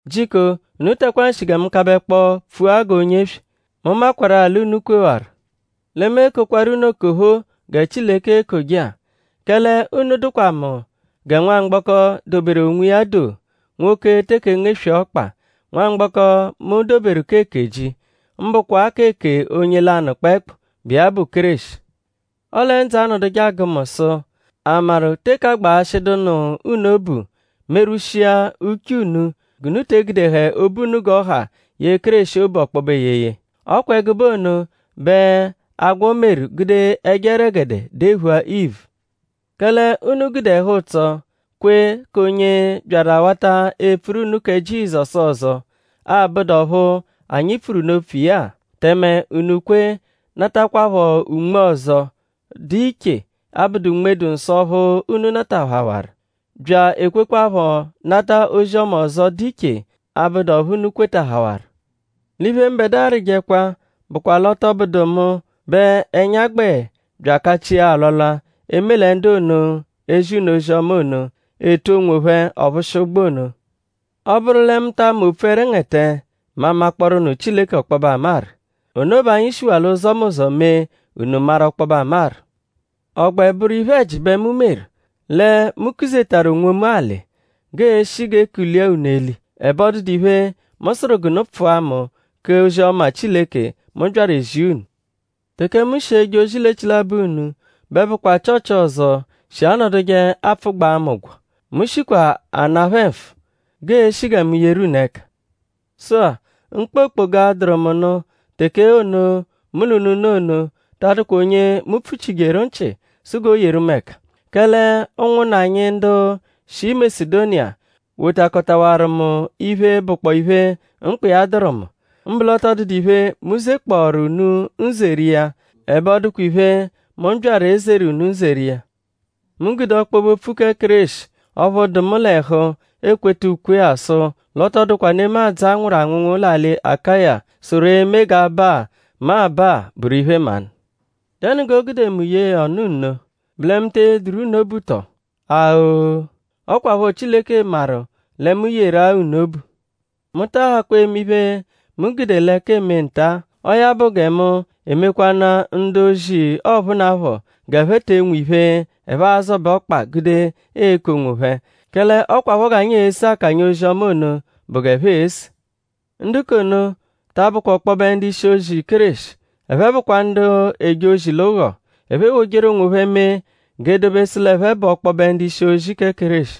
Jiko unu takwaa nshi gẹ mu kabẹkpo pfua g'onye eswe; mu makwarụ-a l'unu kwewaru. Lẹ mu ekokwaru unu okophoo gẹ Chileke ekoje-a. Kẹle unu dụkwa mu gẹ nwamgbọko, doberu onwiya do, nwoke eteke ngeswee ọkpa; nwamgbọko, mu doberu k'eke ji; mbụkwa k'eke onye lanụ kpẹekpu, bụ iya bụ Kéreshi. Ọle ndzụ anọduje agụ mu sụ?a maru teke agbaghashịdu nụ unu obu; merwushia uche unu g'unu te egudehẹ obu unu g'ọ ha yee Kéreshi obu ọkpobe eyeye. Ọ kwa ẹgube ono bẹ agwọ meru gude ẹjo ẹregede dephua Ivu. Kẹle unu gude ẹhu-ụtso kwe k'onye byaru bya awata epfuru unu kẹ Jizọsu ọzo, abụdu ọphu anyi pfuru unu opfu iya-a; tẹme unu kwe natakwaphọ unme ọzo, dụ iche, abụdu Unme-dụ-Nsọ ọphu unu natahawaru; bya ekwekwaphọ nata ozi-ọma ọzo, dụ iche, abụdu ọphu unu kwetahawaru. L'iphe, mbẹdua arịjekwa bụkwa l'ọ tọ bụdu mu bẹ ẹnya gbẹ bya akachia alwalwa eme lẹ ndu ono, ezi unu ozi-ọma ono, etu onwophẹ ọ-phụshia-ụgbu ono. Ọ -bụru lẹ mu ta ama epfu opfu ẹrengete; mu amakpọoru nụ Chileke ọkpobe amaru. Ono bẹ anyi shiwaa l'ụzomuzo mee unu maru ọkpobe amaru. ?Ọ gbẹ bụru iphe-ẹji bẹ mu meru; lẹ mu kuzetaru onwomu alị g'ee-shi g'e kulia unu eli; ẹbe ọ dụdu iphe, mu sụru g'unu pfụa mu k'ozi-ọma Chileke, mu byaru ezia unu? Teke mu shi eje ozi l'echilabọ unu; bẹ bụkwa Chịochi ọzo shi anọduje apfụgbaa mu ụgwo. Mu shikwa ana phẹ nfụ; g'eeshi gẹ mu yeru unu ẹka. Sụ-a; mkpa okpoga, dụru mu nụ teke ono, mu l'unu nọ ono ta adụkwa onye mu pfuchijeru nchị sụ g'o yeru mu ẹka. Kẹle ụnwunna anyi ndu shi Masedoniya wotakọtawaru mu iphe, bụkpoo iphe, mkpa iya dụru mu. Mbụ l'ọ tọ dụdu iphe, mu zekpọoru unu nzeri iya. Ẹbe ọ dụkwa iphe, mu byaru ezeru unu nzeri iya. Mu gude ọkpobe-opfu kẹ Kéreshi ọphu dụ mu l'ẹhu ekweta ukwe-a sụ l'ọ tọ dụkwa nemadzụ, a nwụru anwụnwu l'alị Akaya, sụru eme g'aba-a, mu aba-a bụru iphe-mmanụ. ?Dẹnu g'o gude mu yee ya ọnu nno??Bụ lẹ mu te eyeduru unu obu tọ? A-o! Ọ kwaphọ Chileke maru lẹ mu yeru-a unu obu. Mu taa hakwa eme iphe, mu gude l'ẹka eme nta-a. Ọo ya bụ gẹ mu emekwanụ-a ndu-ozi ọphunapho g'ẹphe te enwehẹ iphe, ẹphe a-zọbe ọkpa gude eku onwophẹ; kẹle ọ kwaphọ g'anyi ese akanya ozi-ọma ono bụ g'ẹphe ese. Ndu k'ono ta abụkwa ọkpobe ndu-ishi-ozi Kéreshi. Ẹphe bụkwa ndu eje ozi l'ụgho. Ndu ewojeru onwophẹ mee g'e dobesu l'ẹphe bụ ọkpobe ndu-ishi-ozi kẹ Kéreshi.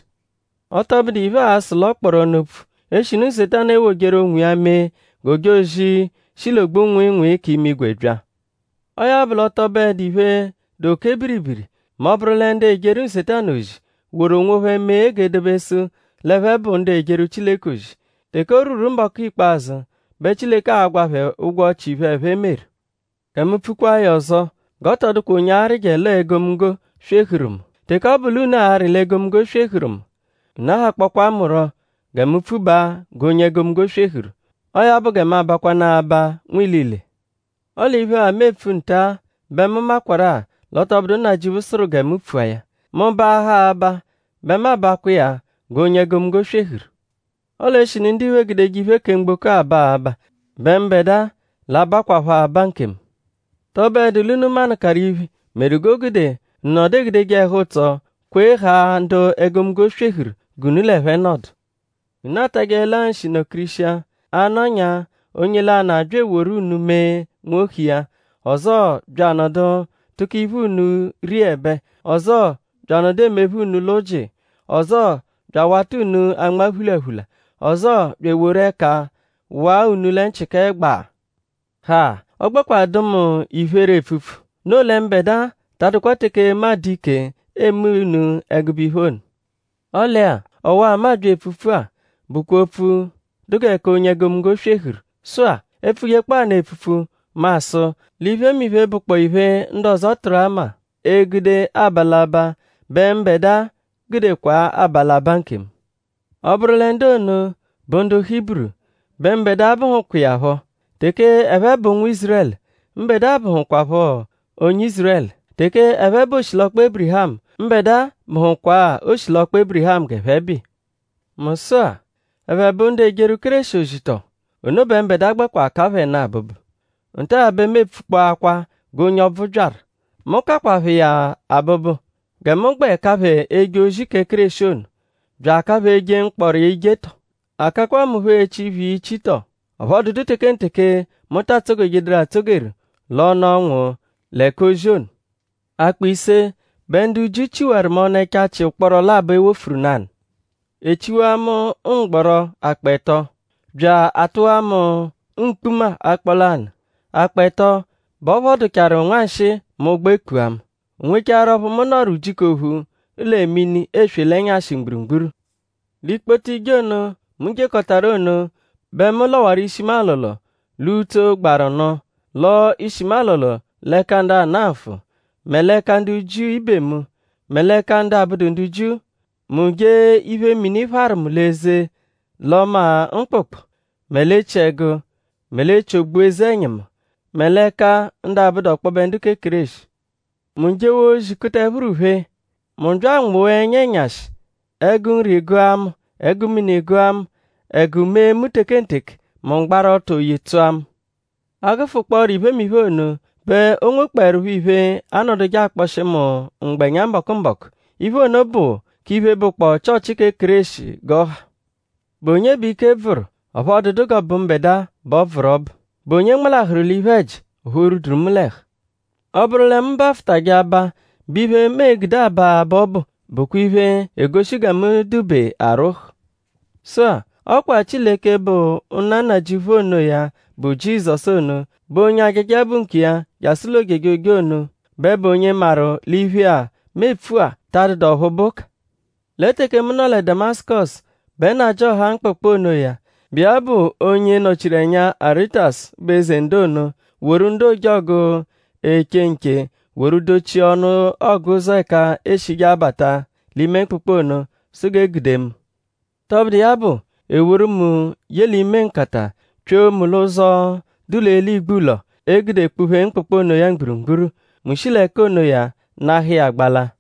Ọ tọ bụdu iphe, aa-sụ l'ọ kpọru ọnu opfu; eshinu Nsetanu ewojeru onwiya mee g'ojozi, shi l'ogbu-nwịinwii k'imigwe bya. Ọo ya bụ l'ọ tọ bụedu iphe, dụ oke biribiri mẹ ọ -bụru lẹ ndu ejeru Nsetanu ozi woru onwophẹ mee g'e dobesụ l'ẹphe bụ ndu ejeru Chileke ozi. Teke o rwuru mbọku ikpazụ bẹ Chileke a-gwa phẹ ụgwo ọchi iphe, ẹphe meru. Gẹ mu pfukwaa ya ọzo; g'ọ tọ dụkwa onye arịje l'ọo egomunggo swehuru mu. Teke ọ bụ l'unu arị l'egomunggo swehuru mu; unu ahakpọkwaa mu rọ gẹ mu pfubaa g'onye egomunggo swehuru. Ọo ya bụ gẹ mu abakwanaa aba nwilile. Ọle iphe-a, mu epfu nta-a bẹ mu makwarụ-a l'ọ tọ bụdu Nnajịuphu sụru gẹ mu pfua ya. Mu -baaha aba bẹ mu abakwa iya g'onye egomunggo swehuru. Ọle eshinu ndiphe egudeje iphe kẹ mgboko-a aba abaa bẹ mbẹdua l'a-bakwaphọ aba nkemu. ?Tọ bụedu l'unu manụkaru iphe meru g'o gude unu nọdu egudeje ẹhu-ụtso kwe haa ndu egomunggo swehuru g'unu l'ẹphe nọdu. Unu atajẹelaa nshi nọ-kirishia; a -nọnyaa onye lanụ abya eworu unu mee nwohu iya; ọzoo bya anọdu tụko iphe unu riẹbe; ọzoo bya anọdu emephe unu l'ụji; ọzoo bya awata unu anma phulaphula; ọzoo bya eworu ẹka waa unu lẹ nchị kẹ gbaa. Ha! Ọ gbẹkwa dụ mu iphere epfupfu; noo lẹ mbẹdua ta adụkwa teke mu adụ ike eme unu ẹgube iphe ono. Ọle-a; ọwa-a, mu abya epfupfu-a bụkwa opfu, dụ gẹ k'onye egomunggo swehuru. Sụ-a; e -pfujekpọo ya epfupfu; mu asụ l'iphemiphe, bụkpoo iphe, ndu ọzo tụru ama egude aba l'aba bẹ mbẹdua gudekwaa aba l'abaa nkemu. Ọ -bụru lẹ ndu ono bụ ndu Hiburu; bẹ mbẹdua bụhukwa iya phọ. Teke ẹphe bụ ụnwu Ízurẹlu; mbẹdua bụhukwapho onye Ízurẹlu. Teke ẹphe bụ oshilọkpa Ébirihamu; mbẹdua bụhukwaa oshilọkpa Ébirihamu g'ẹphe bụ iya. Mu sụ-a;?ẹphe bụ ndu ejeru Kéreshi ozi tọo? Ono bẹ mbẹdua gbẹkwa ka phẹ nụ abụbu. Nta-a bẹ mu epfukpọakwa g'onye, ọbvu byaru. Mu kakwa phẹ iya abụbu; gẹ mu gbẹ ka phẹ eje ozi kẹ Kéreshi ono; bya aka phẹ eje mkpọro iya ijetọ; a kakwa mu phọ echi iphe iya ichitọ. Ọphu ọ dụdu tekenteke mu ta atsogejeduru atsogeru l'ọnu ọnwu lẹ k'ozi ono. Akpọ ise bẹ ndu Jiu chiwaru mu ọnu ẹchachi ụkporo labọ, e wofuru nanụ. E chiwaa mu mgbọro akpọ ẹto; bya atụwaa mu mkpuma akpọ lanụ. Akpọ ẹto bẹ ọ phọduchawaru nwanshịi mẹ ụgbo ekpua mu. O nwecharu ọphu mu nọru ujiku ophu lẹ mini eswe l'ẹnyashi mgburugburu. L'ikpoto ije ono, mu jekọtaru ono bẹ mu lọwaru ishi mu alọlo l'utso, gbaru nụ; lọo ishi mu alọlo l'ẹka ndu ana nfụ; mẹ l'ẹka ndu Jiu ibe mu; mẹ l'ẹka ndu abụdu ndu Jiu. Mu jee iphe mini pharu mu l'eze l'ọma mkpụkpu; mẹ l'echiẹgu; mẹ l'echi ogbu eze-ẹnyimu; mẹ l'ẹka ndu abụdu ọkpobe ndu kẹ Kéreshi. Mu jewaa ozi kuta ẹphuru phee; mu bya anwụwaa ẹnya ẹnyashi; ẹgu nri gụa mu; ẹgu mini gụa mu; ẹgu mee mu tekenteke; mu gbaru ọto oyi tsụa mu. A -gụfukpooro iphemiphe ono; bẹ o nwekpọerupho iphe, anọduje akpọshi mu mgbẹnya mbọku-mbọku. Iphe ono bụ k'iphe, bụkpoo Chịochi kẹ Kéreshi g'ọ ha. ?Bụ onye bẹ ike bvụru; ọphu ọ dụdu g'ọ bụ mbẹdua bẹ ọ bvụru ọbu??Bụ onye nmalahụru l'iphe-ẹji ọphu o rwuduru mu l'ẹhu? Ọ -bụru lẹ mu bafụtaje aba bẹ iphe, mu e-gude aba abaa ọbu bụkwa iphe, egoshi gẹ mu dụ-be arwụhu. Sụ-a; ọ kwa Chileke, bụ Nna Nnajịuphu onoya, bụ Jizọsu ono, bụ onye ajaja bụ nkiya jasụ l'ojejoje ono bẹ bụ onye maru l'iphe-a, mu epfu-a ta adụdu ọphu bụ ụka. Lẹ teke mu nọ lẹ Damasụkosu bẹ nnajịoha mkpụkpu onoya, bụ iya bụ onye nọ-chiru ẹnya Aritasu, bụ eze ndu ono; woru ndu ojọgu, eche nche woru dochia ọnu ọguzo ẹka eeshije abata l'ime mkpụkpu ono sụ g'e gude mu. Tọbudu iya bụ; e woru mu ye l'ime nkata pyoo mu l'ụzo, dụ l'eli igbulọ, e gude kpụ-phee mkpụkpu onoya mgburugburu; mu shi l'ẹka onoya nahụ iya gbalaa.